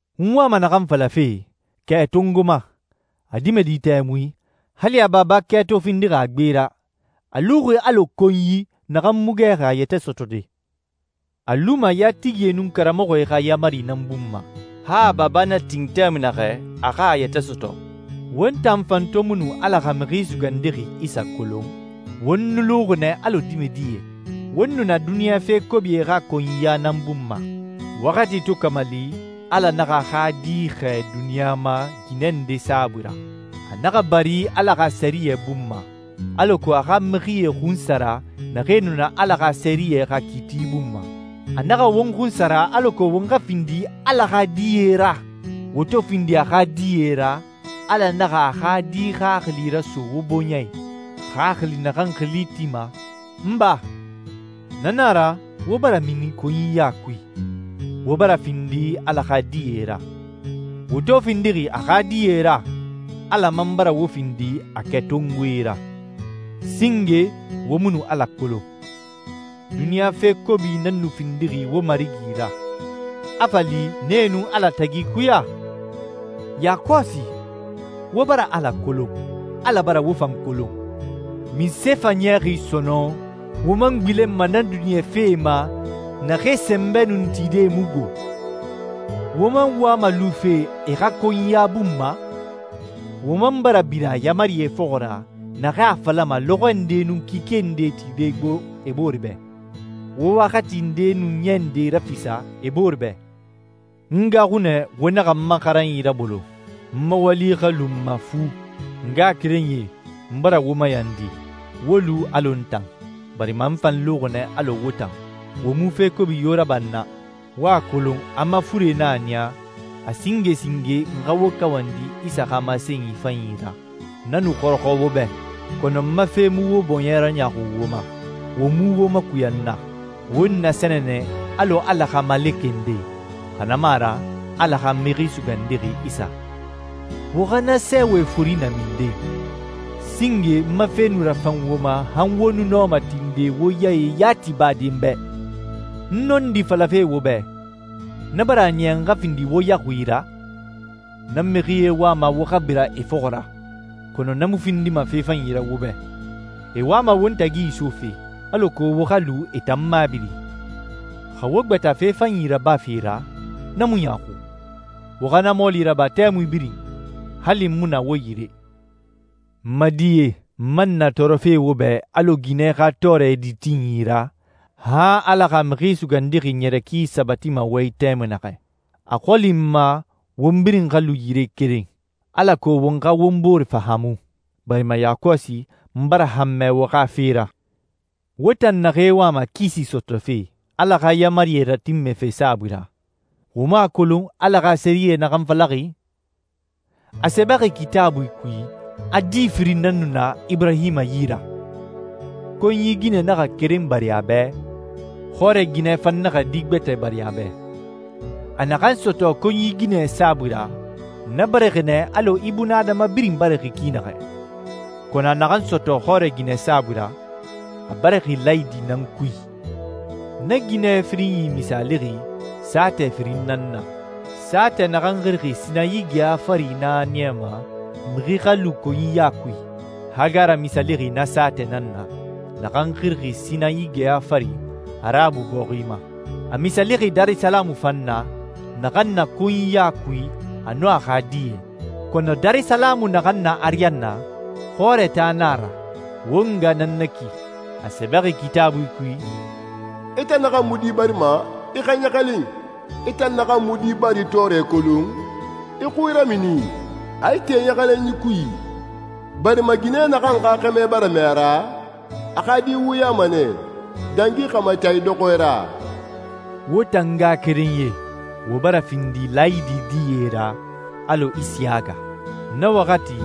N wama naxan falafe, kɛ tongoma, a dimɛdi tɛmui, hali a baba kɛ to findixi a gbe ra, a luxi alɔ konyi naxan mu gɛxi a yɛtɛ sɔtɔde. A luma yatigie nun karamɔxɔe xa yaamari nan bun ma, han a baba na tin tɛmui naxɛ a xa a yɛtɛ sɔtɔ. Won tan fan to mu nu Ala xa Mixi Sugandixi Isa kolon, won nu luxi nɛ alɔ dimɛdie. Won nu na duniɲa fe kobie xa konyiya nan bun ma. Waxati to kamali, Ala naxa a xa Di xɛɛ duniɲa ma ginɛ nde saabui ra. A naxa bari Ala xa sɛriyɛ bun ma, alako a xa mixie xunsara naxee nu na Ala xa sɛriyɛ xa kiiti bun ma. A naxa won xunsara alako won xa findi Ala xa die ra. Wo to findi a xa die ra, Ala naxa a xa Di Xaxili raso wo bɔɲɛ i, xaxili naxan xili tima, «n Ba.» Na nan a ra wo bara mini konyiya kui, wo bara findi Ala xa die ra. Wo to findixi a xa die ra, Ala man bara wo findi a kɛtongoe ra. Singe wo mu nu Ala kolon. Duniɲa fe kobie nan nu findixi wo marigi ra, a fa li nee nun Ala tagi ikuya. Yakɔsi wo bara Ala kolon. Ala bara wo fan kolon. Munse fa a niyaxi sɔnɔn wo man gbilenma na duniɲa fee ma naxee sɛnbɛ nun tide mu gbo? Wo man wama lufe e xa konyiya bun ma? Wo man bara bira yaamarie fɔxɔ ra, naxee a falama lɔxɔɛ ndee nun kike ndee tide gbo e boore bɛ. Wo waxati ndee nun ɲɛ ndee rafisa e boore bɛ. N gaaxu nɛ wo naxa n ma xaranyi rabolo, n ma wali xa lu n ma fu. N ngaxakerenyie, n bara wo mayandi, wo lu alɔ n tan, barima n fan luxi nɛ alɔ wo tan. Wo mu fe kobi yo raba n na. Wo a kolon a n ma fure nan a niya, a singe singe n xa wo kawandi Isa xa masenyi fanyi ra. Na nu xɔrɔxɔ wo bɛ, kɔnɔ n ma fe mu wo bɔɲɛ raɲaaxu wo ma, wo mu wo makuya n na. Wo n nasɛnɛ nɛ alɔ Ala xa malekɛ nde, xa na mu a ra Ala xa Mixi Sugandixi Isa. Wo xa na sɛɛwɛ fori na minden? Singe n ma fe nu rafan wo ma han wo nu nɔma tinde wo yae yati bade n bɛ. N nɔndi falafe wo bɛ, na bara a niya n xa findi wo yaxui ra? Na mixie wama wo xa bira e fɔxɔ ra, kɔnɔ na mu findima fe fanyi ra wo bɛ. E wama won tagi isofe, alako wo xa lu e tan mabiri. Xa wo gbata fe fanyi rabafe ra, na mu ɲaaxu. Wo xa na mɔɔli raba tɛmui birin, hali n mu na wo yire. N ma die, n man na tɔɔrɔfe wo bɛ alɔ ginɛ xa tɔɔrɛ ditinyi ra, han Ala xa Mixi Sugandixi ɲɛrɛ ki sabatima wo i tɛmui naxɛ. A xɔli n ma won birin xa lu yire keren, alako won xa won bore fahaamu, barima yakɔsi n bara hanmɛ wo xa fe ra. Wo tan naxee wama kisi sɔtɔfe Ala xa yaamarie ratinmɛfe saabui ra, wo mu a kolon Ala xa sɛriyɛ naxan falaxi? A sɛbɛxi Kitaabui kui a di firin nan nu na Iburahima yi ra. Konyi ginɛ naxa keren bari a bɛ, xɔrɛ ginɛ fan naxa di gbɛtɛ bari a bɛ. A naxan sɔtɔ konyi ginɛ saabui ra, na barixi nɛ alɔ ibunadama birin barixi ki naxɛ, kɔnɔ a naxan sɔtɔ xɔrɛ ginɛ saabui ra, a barixi laayidi nan kui. Na ginɛ firinyi misaalixi saatɛ firin nan na. Saatɛ naxan xirixi Sinayi geya fari nan a niyama mixi xa lu konyiya kui. Hagara misaalixi na saatɛ nan na, naxan xirixi Sinayi geya fari Arabu bɔxi ma. A misaalixi Darisalamu fan na, naxan na konyiya kui a nun a xa die. Kɔnɔ Darisalamu naxan na ariyanna, xɔrɛ taa nan a ra. Won nga nan na ki. A sɛbɛxi Kitaabui kui, «I tan naxan mu di barima, i xa ɲɛlɛxin. I tan naxan mu di bari tɔɔrɛ kolon, i xui ramini, a ite ɲɛlɛxinyi kui, barima ginɛ naxan xa xɛmɛ bara mɛɛ a ra, a xa di wuyama nɛ, dangi xɛmɛ taa idɔxɔɛ ra.» Wo tan ngaxakerenyie, wo bara findi laayidi die ra alɔ Isiyaga. Na waxati,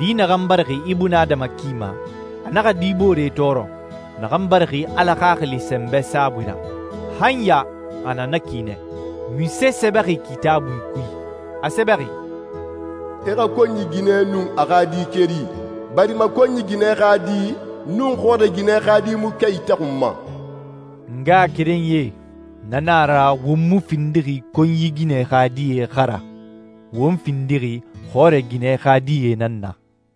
di naxan barixi ibunadama ki ma, a naxa di boore tɔɔrɔ, naxan barixi Ala Xaxili sɛnbɛ saabui ra. Han ya a na na ki nɛ. Munse sɛbɛxi Kitaabui kui? A sɛbɛxi, «I xa konyi ginɛ nun a xa di keri, barima konyi ginɛ xa di nun xɔrɛ ginɛ xa di mu kɛ itaxunma.» N ngaxakerenyie, na nan a ra won mu findixi konyi ginɛ xa die xa ra. Won findixi xɔrɛ ginɛ xa die nan na.